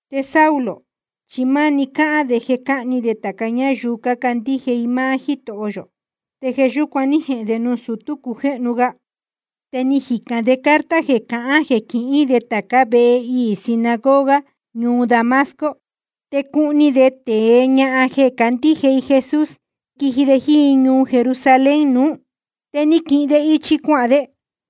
Te Saulo chi máni cáhán de jeē cáhni de tāca ñáyuu cácandíje i máá Jítoho yō, te jeē yúcuan ní jehēn de nuū sutú cujéhnu ga. Te ni jicān de carta jeē cahán jeē quihín de tācá vehe iī sinagoga ñuu Damasco te cuhni de tēe ñahan jeē cácandíje i Jesús, quiji de jíín i ñuu Jerusalén nuú. Te ni quihin de ichi cuahān de.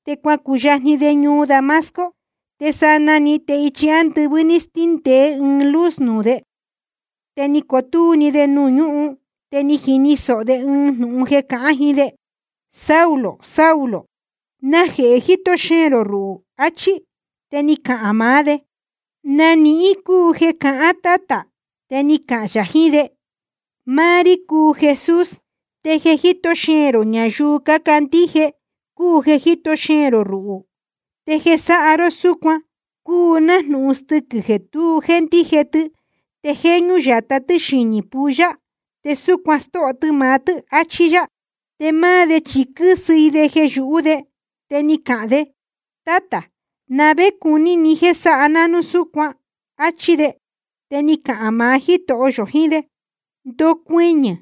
Te cuacuyajni de ñuu Damasco, te sanaa‑ni te ichi ándɨvɨ́ ní stíndēé ɨɨn luz nuū de. Te ni cotúú‑ni de nuū ñúhun, te ni jini sōho de ɨɨn jnūhun cáhán jiín de: Saulo, Saulo, ¿najehē jíto xeēn rō ruhū? achí. Te ni cahān maá de: ¿Na nihín cúu jeē cahán, Tátā? Te ni cahān yā jiín de: Máá rí cúu Jesús, te jeē jíto xeēn rō ñayuu cácandíje i ruhū cúu jeē jíto xeēn rō ruhū. Te jeē sáha ró súcuan cúu nájnūhun stɨquɨ̄ jeē tu jéndíje tɨ te jéñú yatá tɨ́ xinī pulla, te súcuan stóho tɨ maá tɨ́, achí yá. Te máá de chi quɨ́sɨ i de jeē yūhú de, te ni cahān de: Tátā, ¿na vé cuní ni jéē sáha ná núu súcuan? áchí de. Te ni cahān maá Jítoho yō jiín de: Ndocuɨñɨ̄,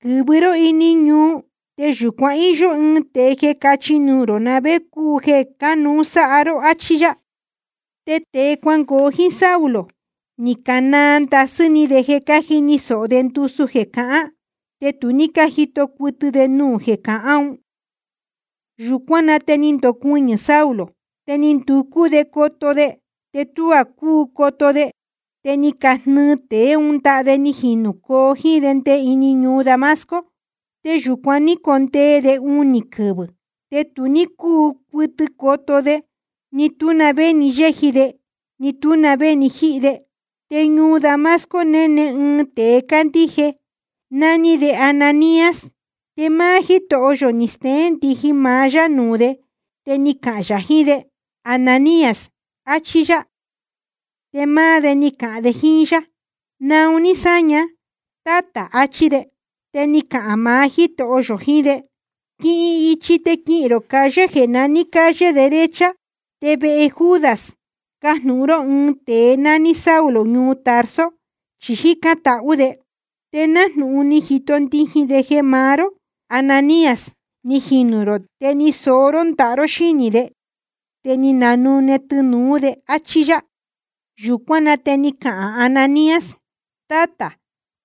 quɨ̄vɨ ró ini ñuu, te yūcuan íyó ɨɨn tēe jeē cachi nuū rō na vé cúu jeē cánuú sáha ró, achí yá. Te tēe cuangoo jíín Saulo, ni canaa ndasɨ́ ni de cájini sōho de ndusu jeē cahán, te tu ní cájito cuɨtɨ de nuū jeē cahán un. Yūcuán na te ni ndocuɨñɨ̄ Saulo. Te ni nducú de coto de, te tuá cúu coto de, te ni cajnɨɨ tēe ún ndaha de ni jinūcoo jíín de nde ini ñuu Damasco. Te yūcuan ní condee de unī quɨvɨ̄. Te tu ní cúu cuɨtɨ coto de, ni tú na vé ni yéji de, ni tú na vé ni jíhi de. Te ñuu Damasco néne ɨɨn tēe cándíje, nání de Ananías. Te máá Jítoho yō ni steén ndijin ya maá yá nuū de te ni cahān yā jiín de: Ananías, achí yá. Te máá de ni cahān de jíín yá: Naun ní sáña, Tátā, áchí de. Te ni cahān maá Jítoho yō jiín de: Quihin ichi te quihīn rō calle jeē naní Calle Derecha, te vehe Judas cajnūhun ró ɨɨn tēe nání Saulo ñuu Tarso, chi jícán tahú de. Te nájnūhun ni jito ndijin de jeē maá ró, Ananías, ni jinū rō, te ni soó ró ndaha ró xínī de, te ni nanune tɨnūú de, áchí yá. Yūcuán na te ni cahān Ananías: Tátā,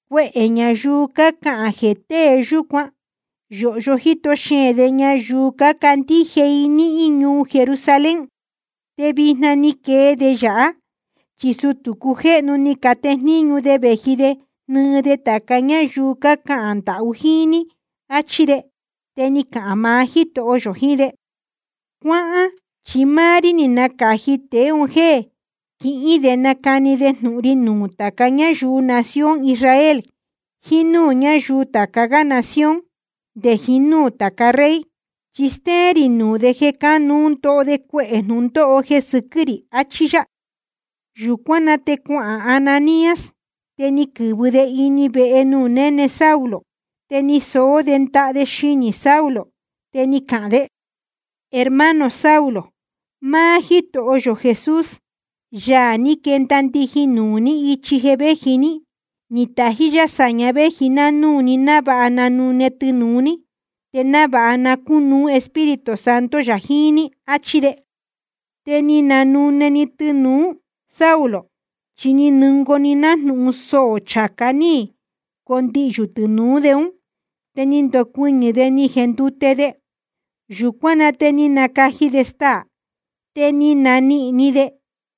cuehē ñayuu cácahān jeē tée yúcuan yōhyo jíto xeēn de ñayuu cácandíje i níhín ñuu Jerusalén. Te vijna ni quee de yāhá, chi sutū cácujéhnu ni catejníñu de vēji de jnɨɨ de tāca ñáyuu cácahān ndahú i jíín ní, áchí de. Te ni cahān maá Jítoho yō jiín de: Cuáhán, chi máá rí ni nacāji tēe un jéē quihīn de nacani de jnūhun ri nuū tāca ñáyuu nación Israel jiín núū ñáyuu tāca gá nación nde jiín núū tāca rey. Chi stéén rī nuū de jeē cánuú ndoho de cuehē jnūndóho jeē sɨquɨ́ rī, achí yá. Yūcuán na te cuahān Ananías. Te ni quɨ̄vɨ de ini vehe nuū néne Saulo, te ni soó de ndaha de xinī Saulo, te ni cahān de: Hermano Saulo, máá Jítoho yō Jesús, Yaā ní quenda ndijin nuū ní ichi jeē véji ní, ni tají yá sāña véji ná núū ni návāha na nánune tɨnūu ní, te návāha na cúnuú Espíritu Santo yā jiín ní, áchí de. Te ni nanune‑ni tɨnūu Saulo, chi ni nungoo‑ni nájnūhun soō chācá ní condihyū tɨnūú de ún. Te ni ndocuɨñɨ̄ de ni jendute de. Yūcuán na te ni nacaji de staā, te ni nanihīn ni de.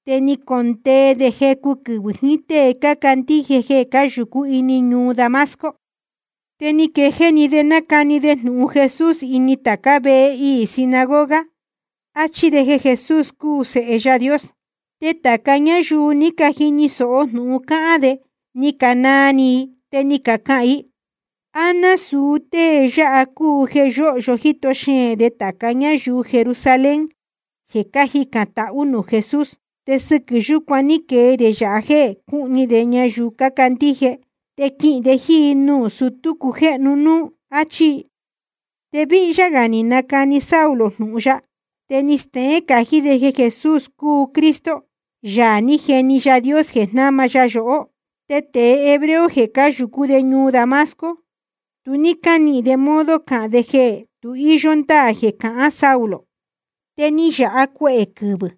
Te ni condee de jecu quɨvɨ̄ jiín tée cácandíje jeē cáyūcú ini ñuu Damasco. Te ni quejéé‑ni de nácani de jnūhun Jesús ini tācá vehe iī sinagoga, áchí de jeē Jesús cúu Sēhe Yaā Dios. Te tāca ñáyuu ni cajini sōho jnūhun cáhán de ni canaa ni i, te ni cacahān i: ¿A násūu tée yáha cúu jeē yóhyo jíto xeēn de tāca ñáyuu Jerusalén jeē cájicān tahú nuū Jesús? Te sɨquɨ̄ yúcuan ní quee de yāha jéē cúhni de ñayuu cácandíje, te quihīn de jíín i nuū sutú cácujéhnu núú, áchí i. Te víhyá gā ni nacani Saulo jnūhun ya, te ni steén cají de jeē Jesús cúu Cristo, Yaā ní jeni Yaā Dios jeē jnáma ya yohó. Te tēe hebreo jeē cáyūcú ñuu Damasco, tu ní cánihīn de modo cahān de jeē tu íyó ndáā jeē cahán Saulo. Te ni yāha cuehē quɨvɨ̄.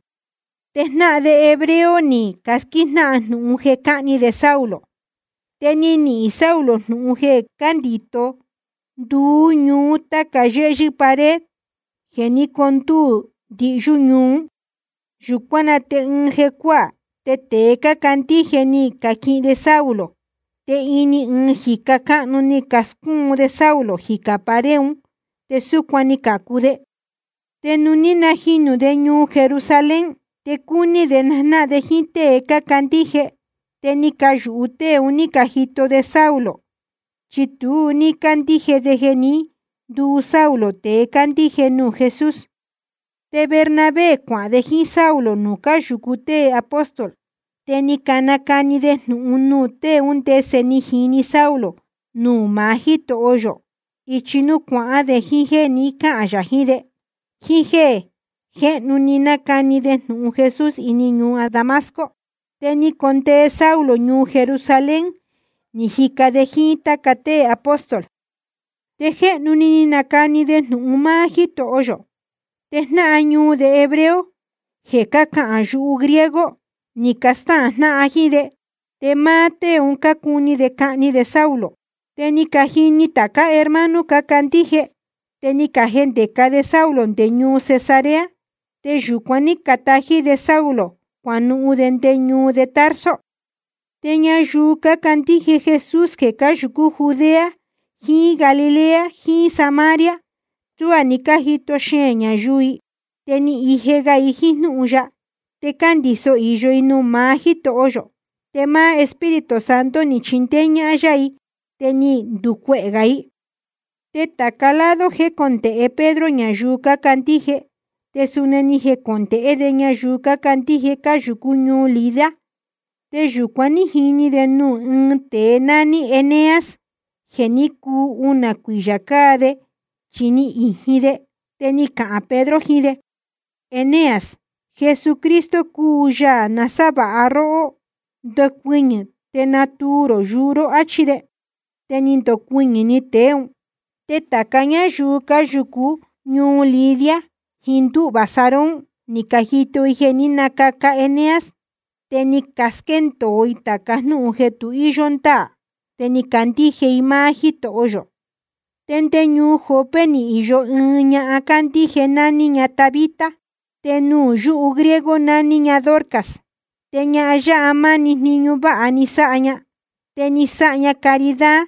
Te jnáhan de hebreo ni casquíjnáhan jnūhun de jeē cáhni de Saulo. Te ni nihīn Saulo jnūhun jeē cándīto de nduú ñuú táca yéhyɨ́ pared jeē ní condúū ndihyú ñuu ún. Yūcuán na te ɨɨn jecuáā te tēe cácandíje ni caquihin de Saulo, te ini ɨɨn jīca cáhnu ni cascúun de Saulo jicā pared ún, te súcuan ni cācu de. Te nuū ní najinū de ñuu Jerusalén, te cúní de najnáhan de jíín tée cácandíje. Te ni cayūhu tée un ní cajito de Saulo, chi tu ní cácandíje de jeē ní nduu Saulo tēe cándíje nuū Jesús. Te Bernabé cuahān de jíín Saulo nuū cáyūcu tée apóstol, te ni nacani de jnūhun nuū tée ún ndese ni jini Saulo nuū maá Jítoho yō ichi nuū cuahán de, jíín jéē ni cáhān yā jiín de, jíín jéē jéhnu‑ni ni nacani de jnūhun Jesús ini ñuu Damasco. Te ni condee Saulo ñuu Jerusalén ni jica de jíín táca tée apóstol. Te jéhnu‑ni ni nacani de jnūhun máá Jítoho yō. Te jnáhan ñuu de hebreo jeē cácahān yuhu griego, ni castáhān jnáhan jíín de, te máá tée un cácuni de cahni de Saulo. Te ni cajini tācá hermano cácandíje, te ni cajendēca de Saulo nde ñuu Cesarea. Te yūcuan ní canatají de Saulo cuanuhun de nde ñuu de Tarso. Te ñayuu cácandíje Jesús jeē cáyūcú Judea jiín Galilea jiín Samaria, tuá ni cájito xeēn ñayuu i. Te ni ije ga i jíín jnúhun ya, te cándīso īyo i nuū maá Jítoho yō. Te Espíritu Santo ni chindéé ñáhán yá i te ni nducuehē gā i. Te tāca lado jécondēhe Pedro ñayuu cácandíje, te suni ni jecondēhé de ñayuu cácandíje cáyūcú ñuu Lida. Te yūcuan ní jini de nuū ɨ́ɨn tēe nání Eneas jeē ní cuu unā cuiyā cáa de chi ni ījin de. Te ni cahān Pedro jiín de: Eneas, Jesucristo cúu Yaā nasávāha ya rohó. Ndocuɨñɨ̄ te natuu rō yuu ró, áchí de. Te ni ndocuɨñɨ̄‑ni tēe ún. Te tāca ñáyuu cáyūcú ñuu Lida jiín ndúhvā Sarón ni cajito i jeē ní nacaca Eneas, te ni casquéndōo i tāca jnúhun jeē tu íyó ndáā te ni cacandíje i máá Jítoho yō. Te nde ñuu Jope ni īyo ɨɨn ñahan cándíje, nání ña Tabita, te nuū yúhu griego nání ña Dorcas. Te ñahan yáha máni jniñu váha ni sáha ña, te ni sáha ña caridad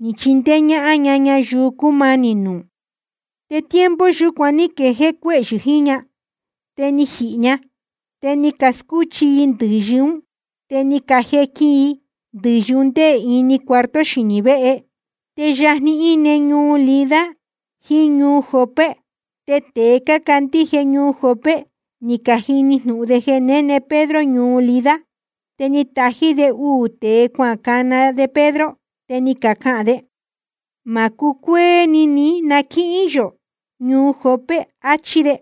ni chindéé ñáhán ña ñayuu cúmanī nuū. Te tiempo yúcuan ní quejéé cuéhyɨ̄ jiín ña, te ni jihī ña. Te ni cascúchi i ndɨ̄yɨ ún, te ni cajequin i ndɨ̄yɨ un ndé ini cuarto xinī véhe. Te yajni íne ñuu Lida jiín ñuu Jope, te tēe cácandíje ñuu Jope ni cajini jnūhun de jeē néne Pedro ñuu Lida, te ni catají de uū tēe cuacana de Pedro, te ni cacahān de: Ma cucuéé ní na quíhín yachī yō ñuu Jope, achí de.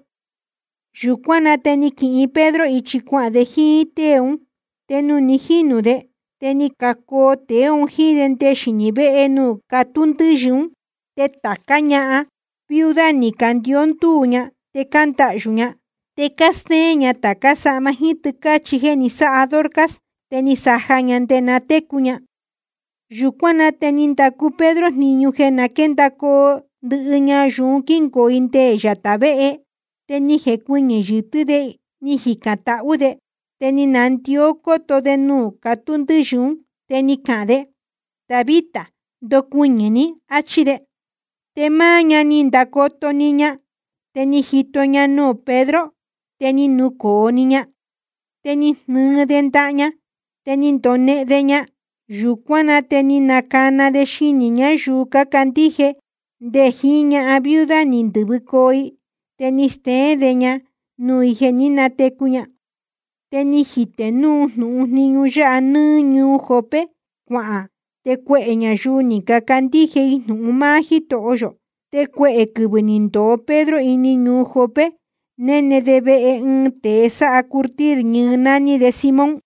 Yūcuán na te ni quihin Pedro ichi cuahān de jíín tée ún. Te nuū ni jínū de, te ni cacoo tēe un jíín de nde xinī véhe nuū catú ndɨ́yɨ ún. Te tācá ñahan viuda ni candicó ndúū ña de cándahyū ña, te cástéén ña tācá sahma jíín tɨ́cāchi jéē ni sáha Dorcas te ni saja ña nde na técu ña. Yūcuán na te ni ndacu Pedro jniñu jeē na quéndacoo ndɨhɨ ñayuu ún quingoo i nde yatā véhe. Te ni jecuɨñɨ̄ yɨtɨ́ de ni jicān tahú de, te ni nandió cóto de nuū catú ndɨ́yɨ ún, te ni cahān de: Tabita, ndocuɨñɨ̄ ní, áchí de. Te máá ña ni ndacoto‑ni ña te ni jito ña nuū Pedro, te ni nucōo‑ni ña. Te ni jnɨɨ de ndaha ña, te ni ndonehen de ña. Yūcuán na te ni nacana de xinī ñáyuu cácandíje nde jiín ñahan viuda ni ndɨ̄vɨcoo i, te ni steén de ña nuū i jeē ní natecu ña. Te ni jitē jnūhun jniñu yáha nɨ́ɨ́ ñuu Jope cuahān, te cuehē ñayuu ni cacandíje i jnūhun máá Jítoho yō. Te cuehē quɨvɨ̄ ni ndōo Pedro ini ñuu Jope, néne de vehe ɨɨn tēe sáha curtir ñɨɨ, nání de Simón.